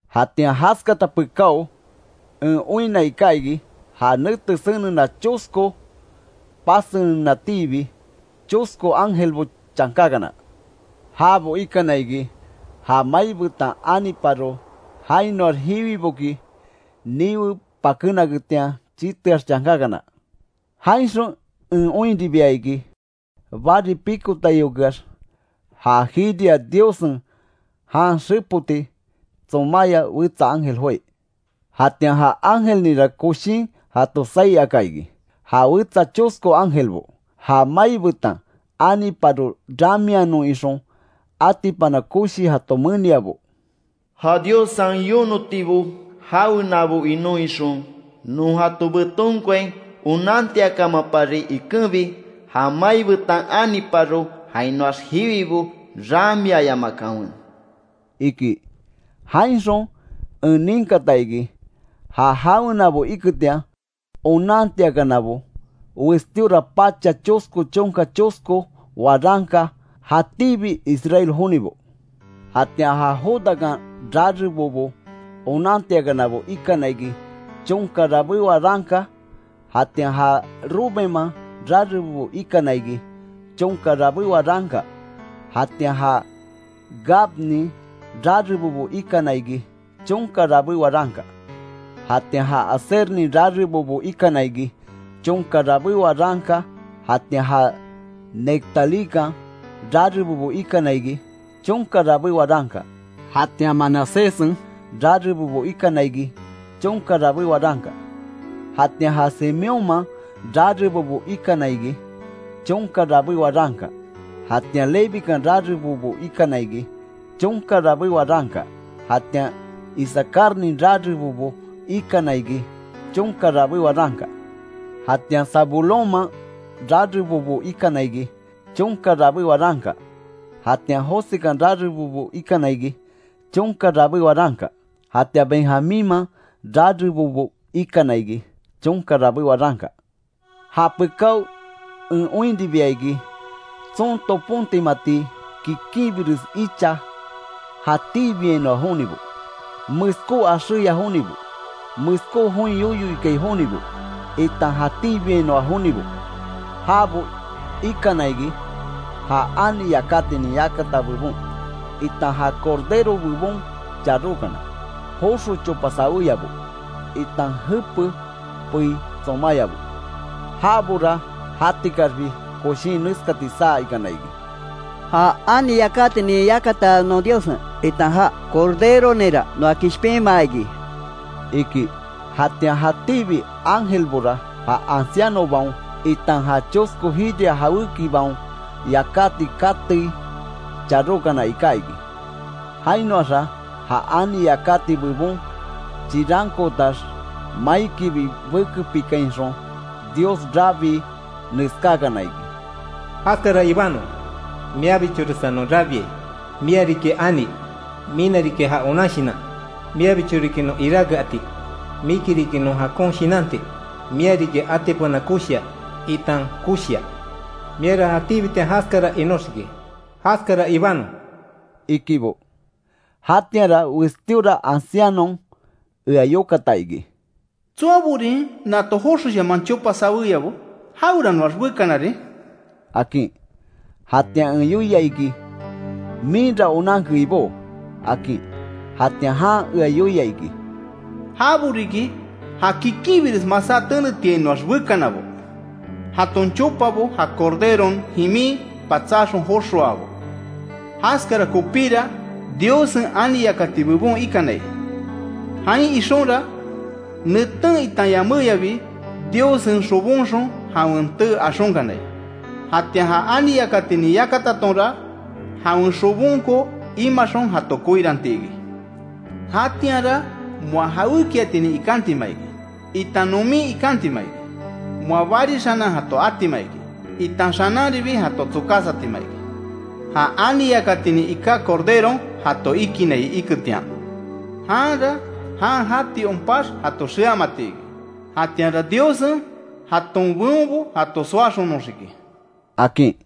Jatian jaskata pekáo en oinna iká iki, ja nete senena chosko pasenenatiibi, chosko ángelbo chankakana. Jabo ikana iki ja mai betan aniparo, jainoax jiwiboki niwe pakénaketian chiteax chankákana. Jainxon en oinribia iki bari pikotaiokeax, ja jiria Diossen jan xepoti tsomaya wetsa ángel joái. Jatian ja ángelninra koshin jato saí aka iki, ja wetsa chosko ángelbo, ja mai betan aniparo ramianon ixon atipana koshi jato meniabo: “¡Ja Diossen yonotibo jawenabo inon ixon, non jato betonkoain onantiakamapari ikenbi, ja mai betan aniparo jainoax jiwibo ramiayamakanwe!” iki. Jainxon en ninkata iki, ja jawenabo iketian onantiakanabo, westíora pacha chosko chonka chosko waranka jatíbi Israel jonibo. Jatian ja Judakan rarebobo onantiakanabo ikana iki: Chonka rabé waranka, jatian ja Rubenman rarebobo ikana iki, chonka rabé waranka; jatian ja Gadnin rarebobo ikana iki, chonka rabé waranka, jatian ja Asernin rarebobo ikana iki, chonka rabé waranka, jatian ja Neftalíkan rarebobo ikana iki, chonka rabé waranka; jatian Manaséssen rarebobo ikana iki chonka rabé waranka, jatian ja Simeónman rarebobo ikana iki, chonka rabé waranka, jatian Levikan rarebobo ikana iki, chonka rabé waranka; jatian Isacarnin rarebobo ikana iki, chonka rabé waranka, jatian Zabulónman rarebobo ikana iki, chonka rabé waranka; jatian Josekan rarebobo ikana iki, chonka rabé waranka, jatian Benjamínman rarebobo ikana iki, chonka rabé waranka. Japekao en oinribia iki, tson topontimati kikinbires icha jatíbiainoa jonibo, meskó axéya jonibo, meskó join yoyo ikai jonibo, itan jatíbiainoa jonibo. Jabo ikana iki, ja ani yakatinin yakata bebon, itan ja Cordero bebon charókana; joxo chopa sawéyabo, itan jepe pei tsomáyabo. Jabora jatikaxbi koshín neskati saa ikana iki: “Ja ani yakatinin yakata non Diossen, itan ja Corderoninra noa kishpinmaa iki”, iki. Jatian jatíbi Ángelbora ja ancianobaon, itan ja chosko jiria jawékibaon yakáti katei charókana iká iki. Jainoaxa ja ani yakati bebon chirankootax, maikibi bekepikainxon Dios rabii, neskákana iki: “¡Jaskara ibanon! Miabichoresa non rabiai, mia riki ani; mina riki ja onan shinan; miabicho riki non iráke ati, miki riki non jakon shinanti; mia riki atipana koshia, itan koshia. Miara jatíbitian jaskara inóxiki. ¡Jaskara Ibanon!” ikibo. Jatianra westíora ancianon ea yokata iki: “¿Tsoaborin nato joxoshaman chopa saweyabo? ¿Jaweranoax bekanarin?” akin. Jatian en yoia iki, “minra onanke Ibó”, akin. Jatian jan ea yoia iki: “Jabo riki ja kikinbires masá tenetiainoax bekanabo, jaton chopabo ja Corderon jimin patsáxon joxoabo. Jaskara kopíra Diossen ani yakati bebon ikanai. Jain ixonra, neten itan yaméyabi, Diossen xobonxon jawen tee axonkanai. Jatian ja ani yakatinin yakatatonra, jawen xobonko imaxon jato koiranti iki. Jatianra moa jawékiatinin ikantima iki, itan nomin ikantima iki. Moa bari xanan jato atima iki, itan xananribi jato tsokásatima iki. Ja ani yakatinin iká Corderon jato ikinai iketian. Janra jan jati onpax jato xeamati iki. Jatianra Diossen jaton beonbo jato soaxonoxiki”, akin.